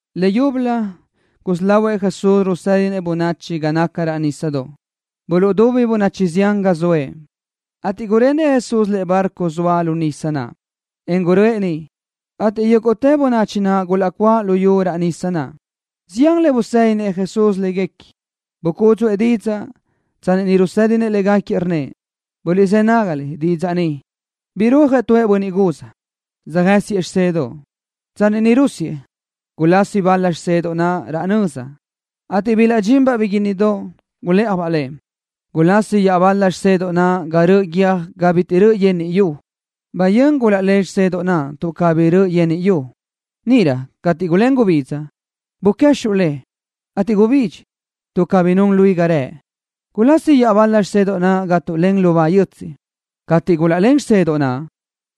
Leyúbölö gusí lahuëʼ Jesús rusédinëʼ bönachi ga naca raʼ nísadoʼ. Buluʼdubi bönachi zián ga zoëʼ, ateʼ gurenëʼ Jesús tu lëʼe bárcodoʼ zxoa lu nisa naʼ, en guröʼë niʼ, ateʼ yúguʼtë bönachi naʼ gulaʼcuáʼ luyú raʼ nisa naʼ. Zián le busédinëʼ Jesús légaquiëʼ, bucúdzuʼë didzaʼ. Tsanni niʼ rusédinëʼ légaquiëʼ, rnnëʼ: —Guliʼzë́ nágaliʼ didzaʼ ni. Birúajëʼ tu bönniʼ guz, söjë́siëʼ xisedoʼ. Tsanni niʼ rúsiëʼ, gulasi bal-la xisedoʼ naʼ raʼ nöza, ateʼ bilaʼdxinbaʼ biguínnidoʼ, gulë́ʼajbaʼ le. Gulasi iaʼbal-la xisedoʼ naʼ ga röʼö guiö́j ga bitiʼ röʼö yenniʼ yu. Bayö́n gulaʼlén xisedoʼ naʼ tuʼ cabí röʼö yenniʼ yu. Níʼirö cateʼ gulén gubidza, buquexuʼ le, ateʼ gubidxi, tuʼ cabí nun luí ga rëʼ. Gulasi iaʼbal-la xisedoʼ naʼ ga tuʼlén lubá yötsiʼ. Cateʼ gulaʼlén xisedoʼ naʼ,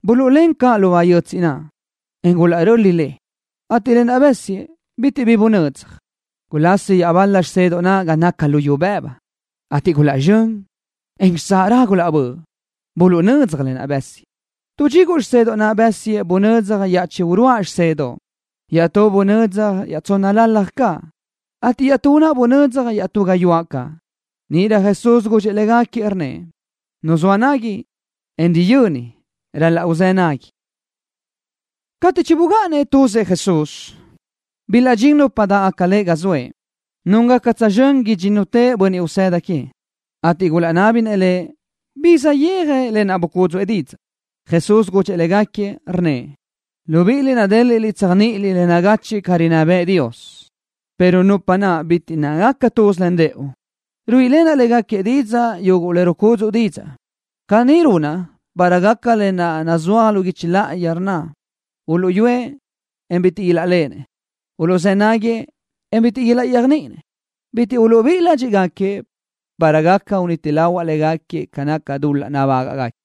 buluʼlén caʼ lubá yötsiʼ naʼ, en gulaʼröli le, ateʼ lë naʼ bësiëʼ bitiʼ bi bunödzaj. Gulasi iaʼbal-la xisedoʼ naʼ ga naca luyú bëbu, ateʼ gulaʼzxö́n, en xitsáʼ raʼ gulaʼbö́ʼ. Buluʼnödzaj lë naʼ bësiëʼ. Tu dxiguʼ xisedoʼ naʼ bësiëʼ bunödzaj iaʼchí uruáʼ xisedoʼ caʼ. Iaʼtú bunödzaj iaʼtsónnalalaj caʼ, ateʼ iaʼtú naʼ bunödzaj iaʼtú gayuáʼ caʼ. Níʼirö Jesús gudxëʼ légaquiëʼ, rnnëʼ: —Nu zoa nagui, en riyöni ral-laʼ uzë́ nagui. Cateʼ chibugáʼanëʼ tuzëʼ Jesús, bilaʼdxín nupa dáʼgaca Lëʼ ga zoëʼ, núngaca tsözxö́n idxínnutëʼ bönniʼ usëda queëʼ, ateʼ gulaʼnábinëʼ Lëʼ bi saʼyéaj lë naʼ bucúdzuʼë didzaʼ. Jesús gudxëʼ légaquiëʼ, rnnëʼ: —Libiʼiliʼ nadéliʼliʼ tséajniʼiliʼ le nagachiʼ ca rinná bëʼë Dios, pero nupa naʼ bitiʼ nácagaca tuz len rëʼu, ruíʼilenaʼ légaquiëʼ didzaʼ yuguʼ le rucúdzuʼa didzaʼ. Caní runaʼ para gaca lë naʼ nazúaj lu guichi láʼayi, rnna: Uluʼyúëʼ, en bitiʼ ilaʼléʼenëʼ. Uluʼzë́ nágagaquiëʼ, en bitiʼ ilaʼyéajniʼinëʼ. Bitiʼ uluʼbíʼi ládxiʼgaquiëʼ para gaca uniti lahuaʼ légaquiëʼ ca naca dul-laʼ nabágaʼgaquiëʼ.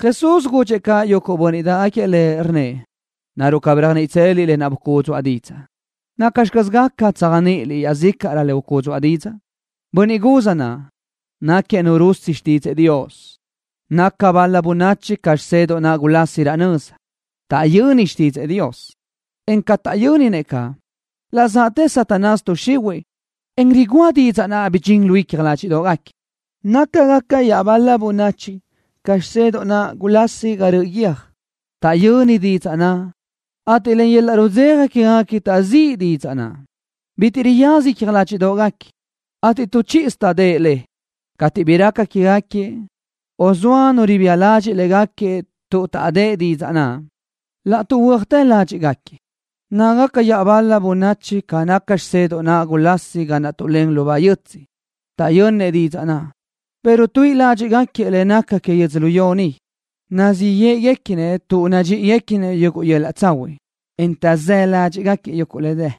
Jesús gudxëʼ caʼ yuguʼ bönniʼ dáʼgaquiëʼ Lëʼ, rnnëʼ: —¿Naruʼ cabí réajniʼitseliʼ lë naʼ bucúdzuʼa didzaʼ? ¿Nacxi caz gaca tséajniʼiliʼ iaʼzícaʼrö le ucúdzuʼa didzaʼ? Bönniʼ guz naʼ náquiëʼ nu ruzë́ xtídzëʼë Dios. ’Nácagaca bal-la bönachi ca xisedoʼ naʼ gulasi raʼ nöza. Taʼyönnëʼ xtídzëʼë Dios, en ca taʼyö́nisinëʼ caʼ, laʼ zaʼtë Satanás tuʼ xihuiʼ, en rigúa didzaʼ naʼ bidxín lu icja ládxiʼdoʼgaquiëʼ. ’Nácagaca iaʼbal-la bönachi ca xisedoʼ naʼ gulasi ga röʼö guiö́j. Taʼyönnëʼ didzaʼ naʼ, ateʼ len yöl-laʼ rudzeja quégaquiëʼ taʼziʼë le. Bitiʼ riyaza icja ládxiʼdoʼgaquiëʼ, ateʼ tu chíʼisö taʼdë́ʼë le. Cateʼ bi raca quégaquiëʼ, o zoa nu ribía ladxiʼ légaquiëʼ tuʼ taʼdë́ʼë didzaʼ naʼ, laʼ tuʼhuö́atë ládxiʼgaquiëʼ. ’Nácagaca iaʼbal-la bönachi ca xisedoʼ naʼ gulasi ga naʼ tuʼlén lubá yötsiʼ. Taʼyönnëʼ didzaʼ naʼ, pero tuíʼi ládxiʼgaquiëʼ le nácagaca que yödzölió ni. Nazíʼ yéʼeguequinëʼ tuʼ nadxíʼiguequinëʼ yuguʼ yöl-laʼ tsahuiʼ, en taʼzë́ ládxiʼgaquiëʼ yuguʼ le dë.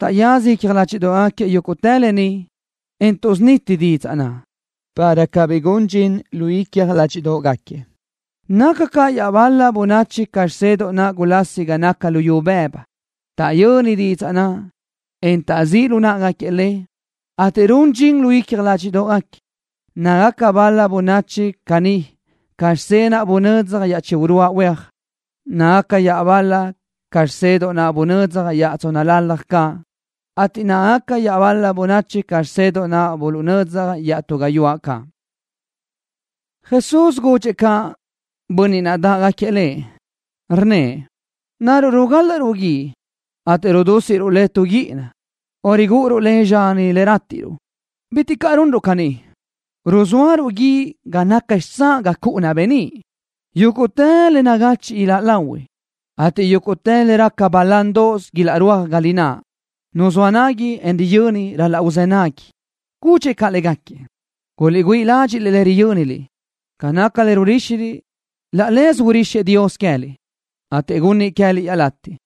Taʼyaza icja ládxiʼdoʼgaquiëʼ yúguʼtë lë ni, en tuʼsuniti didzaʼ naʼ, para cabí gun dxin lu icja ládxiʼdoʼgaquiëʼ. ’Nácagaca iaʼbal-la bönachi ca xisedoʼ naʼ gulasi ga naca luyú bëbu. Taʼyönnëʼ didzaʼ naʼ, en taʼzíʼ lu náʼagaquiëʼ le, ateʼ run dxin lu icja ládxiʼdoʼgaquiëʼ. Nácagaca bal-la bönachi caní ca xisedoʼ naʼ buluʼnödzaj iaʼchí uruáʼ huéaj. Nácagaca iaʼbal-lëʼ ca xisedoʼ naʼ buluʼnödzaj iaʼtsónnalalaj caʼ, ateʼ nácagaca iaʼbal-la bönachi ca xisedoʼ naʼ buluʼnödzaj iaʼtú gayuáʼ caʼ. Jesús gudxëʼ caʼ bönniʼ dáʼgaquiëʼ Lëʼ, rnnëʼ: —¿Naruʼ rigálaʼruʼ guíʼ, ateʼ rudúsiʼruʼ le tu guíʼina, o rigúʼuruʼ le zxani le rátiʼruʼ? Bitiʼ caʼ runruʼ caní. Ruzóaruʼ guíʼ ga naca xitsáʼ ga cuʼu beníʼ. Yúguʼtë le nagachiʼ iláʼ lahui, ateʼ yúguʼtë le raca balándoʼos ilaʼrúaj ga lináʼ. Nu zoa nagui, en riyöni ral-laʼ uzë́ nagui. Gudxëʼ caʼ légaquiëʼ: —Guliʼgüíʼ ládxiʼliʼ le riyö́niliʼ. Ca naca le ruríxiliʼ, laʼ leze urixëʼ Dios queë́liʼ, ateʼ gunnëʼ queë́liʼ iaʼlatiʼ.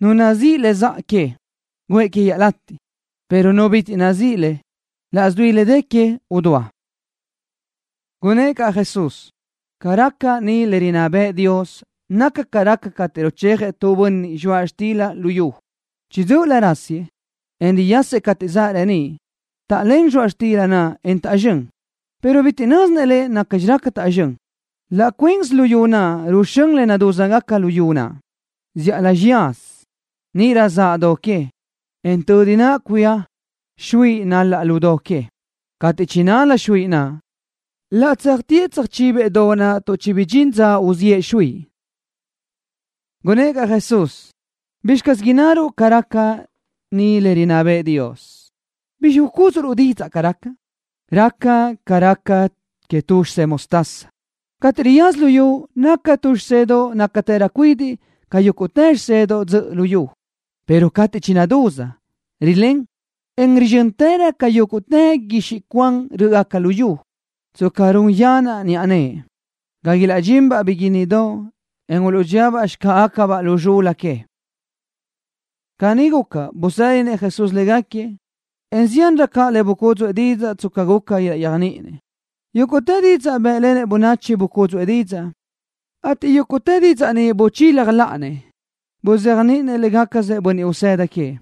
Nu nazíʼi le zaʼ que, guʼë que iaʼlatiʼ, pero nu bitiʼ nazíʼi le, laʼs dui le dë que, udúa. Gunnë́ʼ caʼ Jesús: —Ca raca ni le rinná bëʼë Dios naca ca raca cateʼ ruchejëʼ tu bönniʼ zxoaʼ xtila lu yu. Chiʼi dzö́ʼölö rásiëʼ, en riyasëʼ cateʼ zaʼ reníʼ. Taʼlén zxoaʼ xtila naʼ, en taʼzxö́n, pero bitiʼ nö́zinëʼ lëʼ nacxi raca taʼzxö́n. Laʼ cuinsi luyú naʼ ruxö́n le nadúzgaca luyú naʼ, zíʼalö xiyazi, níʼirö zaʼ do que, en tödi naʼ cuía xuiʼi nál-la lu do que. Cateʼ chinal-la xuiʼi naʼ, laʼ tséajtëʼ tsöjchibëʼ do naʼ tuʼ chibidxín dza uziʼë xuiʼi. Gunnë́ʼ caʼ Jesús: —¿Bizxi caz innaruʼ ca raca ni le rinná bëʼë Dios? ¿Bizxi ucúdzuʼruʼ didzaʼ ca raca? Raca ca raca que tu xisedoʼ mostaza. Cateʼ riyaza luyú naca tu xisedoʼ nácatërö cuidiʼ ca yúguʼtë xisedoʼ dzöʼö luyú, pero cateʼ chinadúz, rilén, en rizxö́ntërö ca yúguʼtë guixiʼ cuan rö́ʼgaca luyú. Tsca run yanaʼ niʼa nëʼe, gaca ilaʼdxinbaʼ biguínnidoʼ, en uluʼdxíabaʼ xicáʼagacabaʼ lu zxul-la que. Caní guca, busédinëʼ Jesús légaquiëʼ, en ziánrö caʼ le bucúdzuʼë didzaʼ tsca guca ilaʼyéajniʼinëʼ. Yúguʼtë didzaʼ bë́ʼlenëʼ bönachi bucúdzuʼë didzaʼ, ateʼ yúguʼtë didzaʼ ni buchila láʼanëʼ, buzéajniʼinëʼ légacasëʼ bönniʼ usëda queëʼ.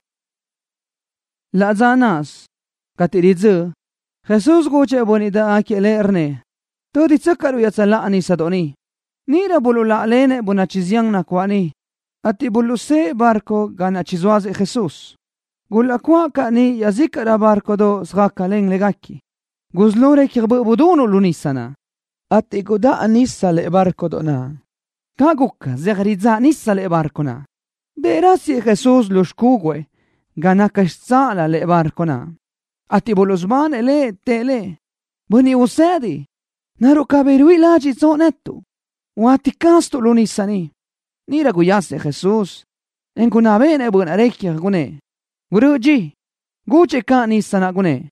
Laʼ dza náʼasö, cateʼ ridzö́ʼ, Jesús gudxëʼ yuguʼ bönniʼ dáʼgaquiëʼ Lëʼ, rnnëʼ: —Tö́ditsöcaʼruʼ iaʼtsöláʼa nísadoʼ ni. Níʼirö buluʼláʼalenëʼ bönachi zián nacuáʼ niʼ, ateʼ buluʼsë́ʼë bárcodoʼ ga naʼ chizóasëʼ Jesús. Gulaʼcuáʼ caʼ niʼ iaʼzícaʼrö bárcodoʼ söjácalen légaquiëʼ. Gusí lo recja böʼ budunuʼ lu nisa naʼ, ateʼ gudáʼa nisa lëʼe bárcodoʼ naʼ. Caʼ guca, zeaj ridzáʼ nisa lëʼe bárcodoʼ naʼ. Dëʼ rásiëʼ Jesús lu xicúgüëʼ ga naca xitsáʼalö lëʼe bárcodoʼ naʼ, ateʼ buluʼsubanëʼ Lëʼ. Tëʼ Lëʼ: —¡Bönniʼ Usedi! ¿Naruʼ cabí ruíʼi ládxiʼtsoʼ netuʼ? ¡Huáti caztuʼ lu nisa ni! Níʼirö guyasëʼ Jesús, en gunná béʼenëʼ böʼ naʼ recja, gunnë́ʼ: —Gurö́ʼö dxi. Gudxëʼ caʼ nisa naʼ, gunnë́ʼ: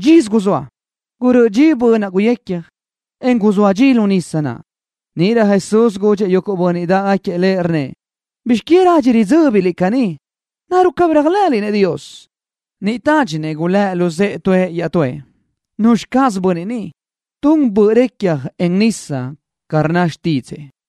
—Dxisö guzóa. Gurö́ʼö dxi böʼ naʼ guyecja, en guzóa dxi lu nísadoʼ naʼ. Níʼirö Jesús gudxëʼ yuguʼ bönniʼ dáʼgaquiëʼ Lëʼ, rnnëʼ: —¿Bizx que radxi ridzö́biliʼ caní? ¿Naruʼ cabí réajlëʼëliʼ Dios? Niʼ tádxinëʼ gulë́ luzë́ʼë tuëʼ iaʼtúëʼ: —¿Nuzxi caz bönniʼ ni? ¡Tun böʼ recja, en nísadoʼ ca rnna xtídzëʼë!